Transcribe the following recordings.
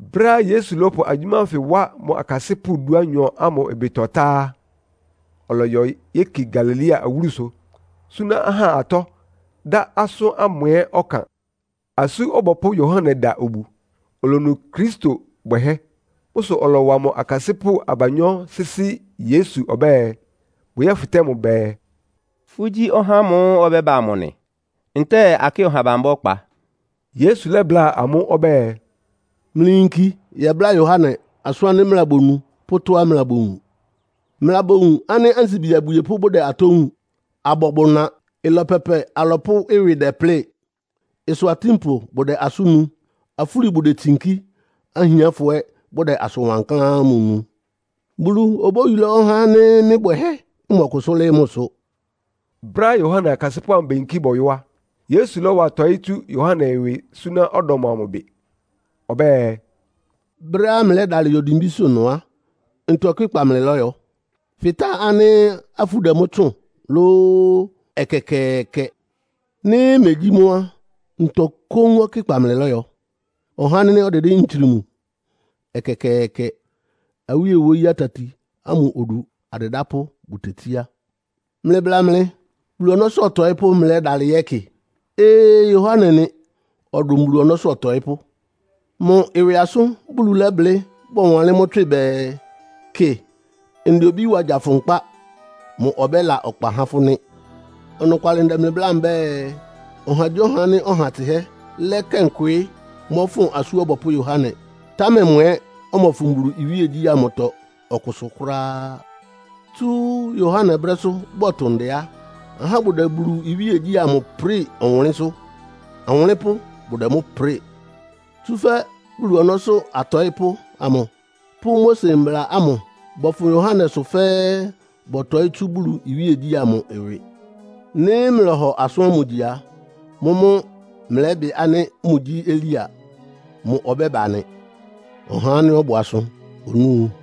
Brɛ́á Yesu lɔ́pʋ agyʋ́má ánfɩ wá mʋ akasɩ́pʋ́ dúanyɔ ámʋ ɩbɩtɔ tá á, ɔlɔyɔ yéki Galilea awúlusʋ, súná ahá atɔ́, dá asʋ́n ámʋ ɛ́ ɔkan. Asú Ɔbɔpʋ́ Yohane da obu, olonu Kristo bwɛhɛ́. Mʋ́ sʋ ɔlɔwa mʋ akasɩ́pʋ́ abanyɔ́ sɩ́sɩ́ Yesu ɔbɛ́ɛ, bʋyɛ́fɩtɛ́ mʋ bɛɛ, “Fʋ́gyí ɔhá ámʋ́ʋ́ ɔbɛ́ba amʋ nɩ, ntɛ́ɛ akɩ́ɩ ɔha bambá ɔkpa?” Yesu lɛ́bláa amʋ́ ɔbɛ́ɛ, “Mlɩyinki yɛbláa Yohane asʋ́n ánɩ́ mlɩlabonu pʋ́ atɔ́á mlɩlabowun. Mlɩlabowun ánɩ́ ansibi abwiepʋ́ bʋdɛ atɔ́ wun, abɔ bʋna. Ɩlɔ pɛpɛ alɔpʋ́ ɩwɩ dɛplɩ́ɩ. Ɩsʋ atínpʋ bʋdɛ asʋ́n nu. Afúli bʋdetsinkí, ahiánfɔ ɛ́ bʋdɛ asʋn wankláán ámʋ nu. Bulu obóyulá ɔhá ánɩ́ mɩ́ bwɛhɛ́ mɔkʋsʋ́ lɩ́ɩ́ mʋsʋ.” Brɛ́á Yohane akasɩ́pʋ́ ámʋ beyinkí bɔyɔ́ á, Yesu lɔ́wa tɔɩ́ tsú Yohane ɩwɩ súná ɔdɔm amʋ bɩ. Ɔbɛ́ɛ, “Brɛ́á mlɩlɛ́dalɩ yɔ dimbísʋ́ ɩnʋ á, ntɔ ɔkɩ́kpa mlɩlɔ́yɔ? Fɩtáa ánɩ́ afú dɛ mʋ́ tsʋ́ʋn lóó? Ɛkɛkɛɛkɛ! Nɩ́ megyí mʋ́ á, ntɔ kóún ɔkɩ́kpa mlɩlɔ́yɔ? Ɔhá ánɩ́ ɔdɩdɩ́ ntsrim? Ɛkɛkɛɛkɛ! Awíe wóyí atati ámʋ odu adɩdápʋ́ bʋtetsíá. Mlɩbla mɩ! Bulu ɔnɔ́sʋ́ ɔtɔɩ́pʋ́ mlɩlɛ́dalɩ yɛ́kɩ? Ee, Yohane nɩ. Ɔdʋn Bulu ɔnɔ́sʋ́ ɔtɔɩ́pʋ́. Mʋ ɩwɩ asʋ́n Bulu lɛ́blɩ́ bɔwanlɩ́n mʋ́ tswɩ bɛɛ, ‘Kɩ, ndɛ obí wa gya fʋ nkpá. Mʋ ɔbɛ́la ɔkpa há fʋ́ nɩ́.’ Ɔnɔkwalɩ ndɛ mlɩ bláa mbɛ́ɛ, ɔhagyíɔha ánɩ́ ɔha tsɩhɛ́ lakɛn kwɩɩ́ mɔ́fʋn Asú Ɔbɔpʋ́ Yohane, támɛ mʋ ɛ́ ɔmɔfʋn Bulu iwíegyí ámʋtɔ ɔkʋsʋ kʋ́ráá. Tsú Yohane brɛ́sʋ́ bɔtʋ ndɛ á, ahá bʋdɛ Bulu iwíegyí ámʋ prɩ́ɩ ɔwʋnlɩ́nsʋ́. Awʋnlɩ́npʋ́ bʋdɛ mʋ́ prɩ́ɩ. Tsúfɛ́ Bulu ɔnɔ́sʋ́ atɔɩ́pʋ́ amʋ pʋ́ Mose Mbla ámʋ bɔfʋn Yohanesʋ fɛ́ɛ́ bɔtɔɩ́ tsú Bulu iwíegyí ámʋ ɩwɩ. Nɩ́ mlɔ́hɔ asʋ́n ámʋ gyi a, mʋ́mʋ́ mlɛ́bɩ ánɩ́ mʋgyí Elia. Mʋ ɔbɛ́ba nɩ. Ɔhá ánɩ́ ɔbʋ asʋ onúu.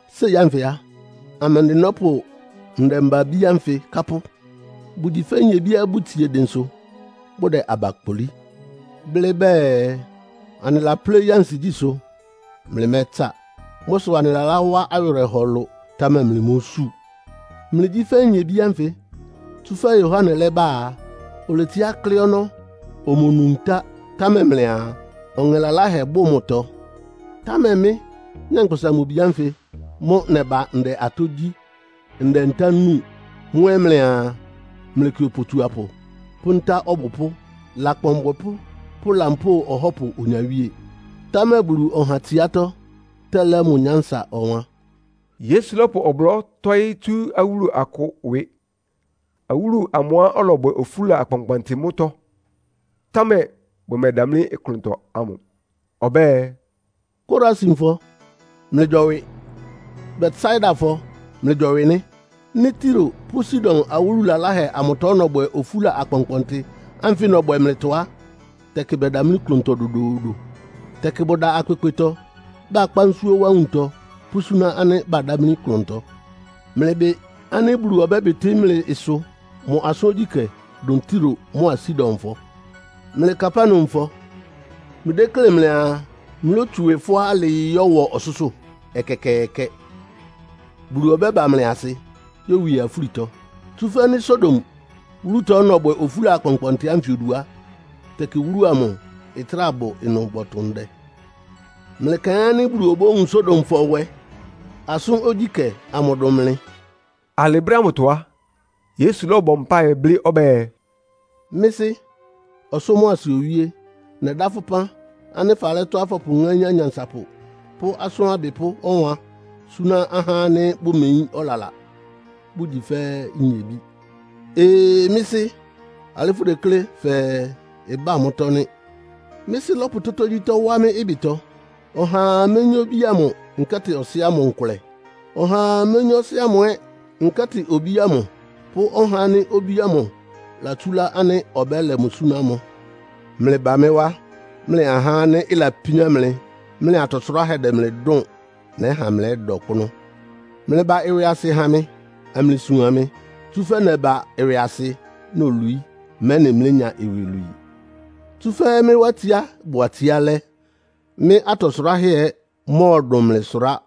“Séi ánfɩ á, amɛndɩ nɔ́pʋ ndɛmba-abí ánfɩ kápʋ́? Bʋgyi fɛ́ nyebíá bʋtsie dɩnsʋ bʋdɛ aba kpolí, blɩ́ bɛɛ, ‘Anɩlapléí ansigyísʋ́, mlɩmɛ́tsa. Mʋ́ sʋ anɩlalá wá awɩrɛhɔ ɩlʋ, támɛ mlɩmósu.’ Mlɩgyí fɛ́ nyebí ánfɩ, tsúfɛ́ Yohane lɛ́ba á, oletsiá klɩ́ ɔnɔ́, omonu ntá, támɛ mlɩaa, ‘Ɔŋɛ laláhɛ bʋ mʋtɔ!’ Támɛ mɩ́, Nyankpʋsa-Mʋ-Bi ánfɩ mʋ́ naba ndɛ atɔ́ gyí, ndɛ ntá núu. Mʋ́ ɛ́ mlɩaa, ‘Mlɩkɩ opotsuapʋ pʋ́ nta ɔbʋpʋ́, lakpan abwɛpʋ́ pʋ́ lampóo ahɔ́pʋ onyawíe.’ Támɛ Bulu ɔha tsiátɔ́ tɛlɛ́ mʋ nyánsa ɔwan.” Yesu lɔ́pʋ ɔblɔ́ tɔ́ɩ́ tsú awúlu akʋ ɩwɩ. Awúlu amʋá ɔlɔbwɛ ofúla akpɔnkpɔntɩ mʋ́tɔ́, támɛ bʋmɛdamlí klʋntɔ ámʋ. Ɔbɛ́ɛ, “Korasinfɔ, mlɩgyɔwɩ. Betsaidafɔ, mlɩgyɔwɩ nɩ́. Nɩ́ Tiro pʋ́ Sidon awúlu laláhɛ amʋtɔ nɔbwɛ ofúla akpɔnkpɔntɩ ánfɩ nɔbwɛ mlɩtɔ á, tɛkɩ bɛdamlí klʋntɔ dodoodo. Tɛkɩ bʋda akpekpetɔ, bakpá nsúó wá nwuntɔ pʋ́súná ánɩ́ badámlí klʋntɔ. Mlɩbɩ ánɩ́ Bulu ɔbɛ́bɩtɩ́ mlɩ ɩsʋ mʋ asʋ́n ogyíkɛ́ dʋn Tiro mʋ́a Sidonfɔ. Mlɩ Kapernaumfɔ, mlɩdéklé mlɩaa mlótsu ɩwɩ fʋ́á alɩɩ yɔ́wɔ ɔsʋ́sʋ́? Ɛkɛkɛɛkɛ! Bulu ɔbɛ́ba mlɩ asɩ yówie afúlitɔ. Tsúfɛ́ nɩ́ Sodom wúlutɔ nɔbwɛ ofúla akpɔnkpɔntɩ ánfɩ odu á, tɛkɩ wúlu amʋ ɩtráa bʋ ɩnʋ bɔtʋ ndɛ. Mlɩkaɩn ánɩ́ Bulu obówun Sodomfɔ nwɛ asʋ́n ogyíkɛ́ amʋ dʋn mlɩ.” Alɩ brɛ́ ámʋtɔ á, Yesu lɔ́bɔ mpáɩ blɩ́ ɔbɛ́ɛ, “Mɩ́ Sɩ́, ɔsʋ́ mʋa asɩ Owíé! Nɛdá fʋ́ ɩpán ánɩ́ falɛ́ tɔ́á fɔpʋŋáín anyansapʋ pʋ́ asʋ́n abɩpʋ́ ɔwan súná ahá ánɩ́ bʋmeyín ɔlala, bʋgyi fɛ́ nyebí. Ee, Mɩ́ Sɩ́! Alɩ́ fʋdeklé fɛɛ ɩbá mʋ́tɔ́ nɩ́.” “Mɩ́ Sɩ́ lɔ́pʋ tógyítɔ́ wá mɩ́ ɩbɩtɔ. Ɔhaa méyín Obí ámʋ, nkɛ́tɩ Ɔsɩ́ ámʋ nkʋlɛ. Ɔhaa méyín Ɔsɩ́ ámʋ ɛ́, nkɛ́tɩ Obí ámʋ pʋ́ ɔhá ánɩ́ Obí ámʋ latsúlá ánɩ́ ɔbɛ́lɛ mʋ súná mʋ.” “Mlɩba mɩ́ wá, mlɩ ahá ánɩ́ ɩlapíán mlɩ, mlɩ atɔ sʋráhɛ́ dɛ mlɩ dʋ́ʋn. Nɛ́ha mlɛ́da ɔkpʋ́nʋ́. Mlɩba ɩwɩasɩ ha mɩ, amlɩsuan mɩ, tsúfɛ́ nɛba ɩwɩasɩ, nolwií, mɛ́nɩ mlénya iwilwii. Tsúfɛ́ mɩ́ wá tsiá bʋ atsiálɛ́. Mɩ́ atɔ sʋráhɛ́ ɛ́ mɔ́ɔdʋn mlɩ sʋrá.”